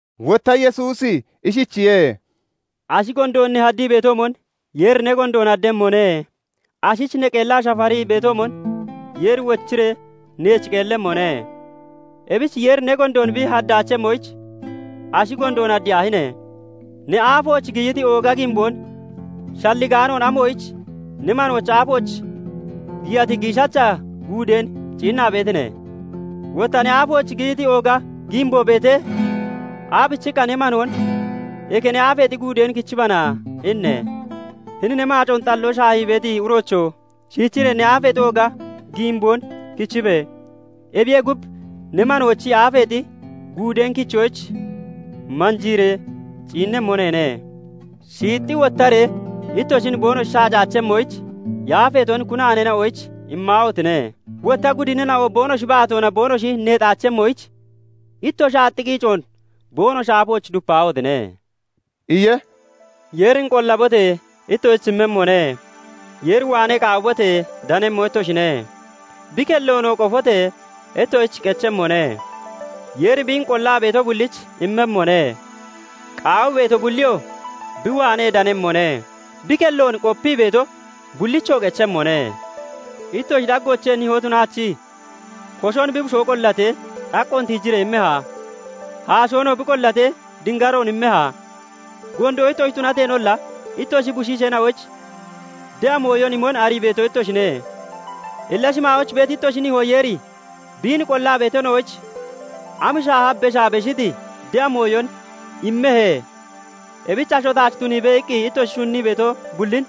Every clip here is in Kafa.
Wotta Yesuusi ishichiye:- "Ashi gondoon ne haddii beetoomon Yeeri ne gondoon haddemmone; ashich ne qeellaa (Shafarii) beetoomon Yeeri wochiree neech qeellemmone. Ebich Yeeri ne gondoon bi haddaachemmoyich, ashi gondoon haddiyaahine! Ne aafooch giyiti ooga giimboon shalligaanoon amoyich ne manoochi aafooch giyati giishacha guudeen ciinnaa beetine? Wotta ne aafooch giyiti ooga giimboo beetee, aabichiqqa ne manoon 'Eke ne aafeexi guudeen kichibana' inne? Hini ne maacoon xalloo shaahii beeti uroocho! shiichiree ne aafeexi ooga giimboon kichibe! Ebiyee gub ne manoochi aafeexi guudeen kichoyich manjiiree ciinnemmo neene. "Shiixxi wottaree ittoshin boonoshi shacaachemmoyich, yaafeeton kunaaneena'oyich immaahotine! Wotta gudinina'o boonoshi baatoona boonoshi neexaachemmoyich, ittoshi aax qiicoon boonoshi aafooch dupaahotine!" iye. "Yeerin qollabote! Ittoshich immemmone. Yeer waanee qaawibote! Danemmo ittoshine. Bi kelloonoo qofote! Ittoshich qechemmone. Yeeri biin qollaa beeto bullich immemmone; qaawii beeto bulliyoo bi waanee danemmone; bi kelloon qopii beeto bullichoo qechemmone. "Ittoshi daggoochee nihoo tunaachi koshon bi bushoo qollatee, xaqqoon tiijiree immeha? Haashoonoo bi qollatee, dingaroon immeha? Gondo ittoshi tunateenolla ittoshi bushiisheena'oyich de'a mooyon imon arii beeto ittoshine. Illa shimaayooch beeti ittoshi nihoo Yeeri biin qollaa beetina'oyich am shaaha beshaa beshiti de'a mooyon immehe? Ebich 'Asho taach tuniibe' iqqi ittoshi shunnii beeto bullin,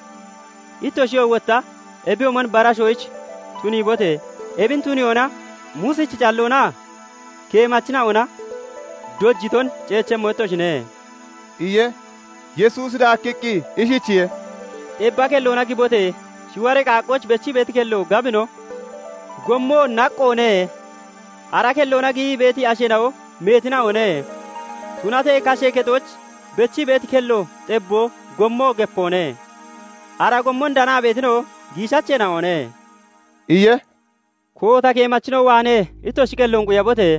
ittoshiyoo wotta ebiyoomon bara ashyich tuniibote! Ebin tuniyoona Muusichi calloonaa keemachina'ona dojiton ceechemmo ittoshine" iye. Yesuusi daakkiqqi ishichiye:- "Xebba kelloona gibote! Shiwaree qaaqqooch bechii beeti kello gabino, gommoo naqqoone; ara kelloona giyii beeti asheena'o meetina'one. Tunatee kashee kexooch bechii beeti kello xebboo, gommoo gepoone. Ara gommon danaa beetina'o giishacheena'one" iye. "Koota keemachina'o waanee ittoshi qelloon quyabote!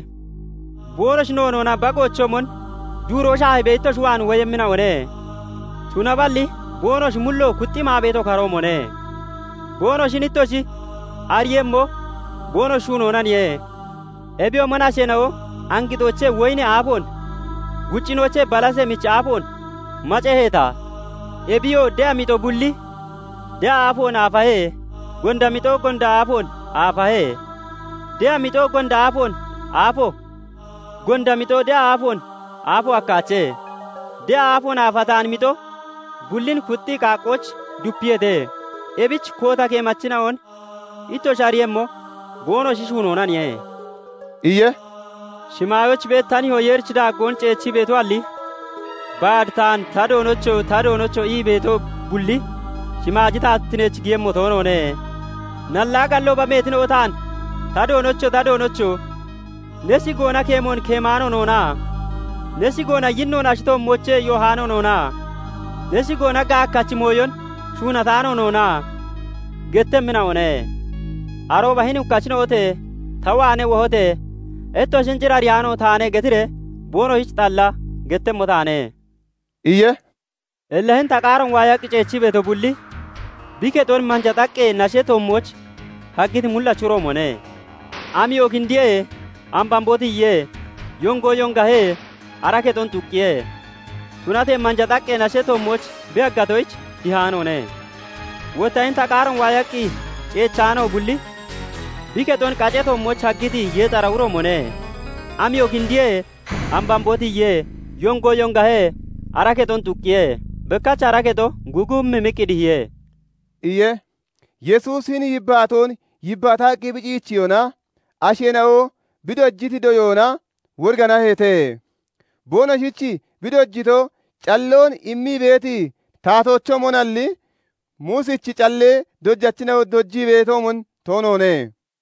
Boonoshi noonoona bagoochoomon duuroo shaahibee ittoshi waan woyemmina'one; tunaballi boonoshi mullo kuxxii maa beeti okaroomone. Boonoshin ittoshi ariiyemmo boonoshi shuunoonaniye. Ebiyoomon asheena'o angixoochee woyinee aafoon, guccinoochee balasee michi aafoon maceheeta? Ebiyoo de'a mixo bulli de'a aafoon aafahe; gonda mixo gonda aafoon aafahe. De'a mixo gonda aafoon aafo, gonda mixo de'a aafoon aafo hakkaache. De'a aafoon aafataani mixo bullin kuxxii qaaqqooch dupiyeete. Ebich koota keemachina'on ittoshi ariiyemmo boonoshi shuunoonaniye" iye. "Shimaayooch beeti ta nihoo Yeerichi daaggoon ceechii beetoalli, baad taan 'Ta Doonocho! Ta Doonocho!' ii beeto bulli shimaaji taatittineech giyemmo toonoone. Nallaa gallooba meetina'o taan 'Ta Doonocho! Ta Doonocho! Ne shigoona keemoon keemaano noonna? Ne shigoona yinnoon ashi toommoochee yoohaano noona? Ne shigoona gaakkachi mooyon shuunataano noona?' gettemmina'one. Arooba 'Hini hukkachina'ote! ta waanee wohote! Ittoshin cir ariyaano taane' getiree boonoshich xalla gettemmo taane" iye. "Illa hini ta qaaroon waayaqqi ceechi beeto bulli, bi kexon manja xaqqee nashee toommooch haggiti mullachi uroomone. Amiyo kindiye; ambamboo tiyiye; yongo yongahe; ara kexon xuqqiye. Tunatee manja xaqqee nashee toommooch bi haggatoyich, dihaanoone. Wotta hini ta qaaroon waayaqqi ceechano bulli, bi kexon qacee toommooch haggiti yeexara uroomone. Amiyo kindiye; ambamboo tiyiye; yongo yongahe; ara kexon xuqqiye; bekkach ara kexo gugumimmiqqi dihiye" iye. Yesuusi hini yibbaatoon yibbaataqqi bi ciichiyona, asheena'o bi dojiti doyoona woriganaheete. Boonoshich bi dojito calloon immii beeti taatoochoomonalli, Muusichi callee dojachina'o dojii beetoomon toonoone.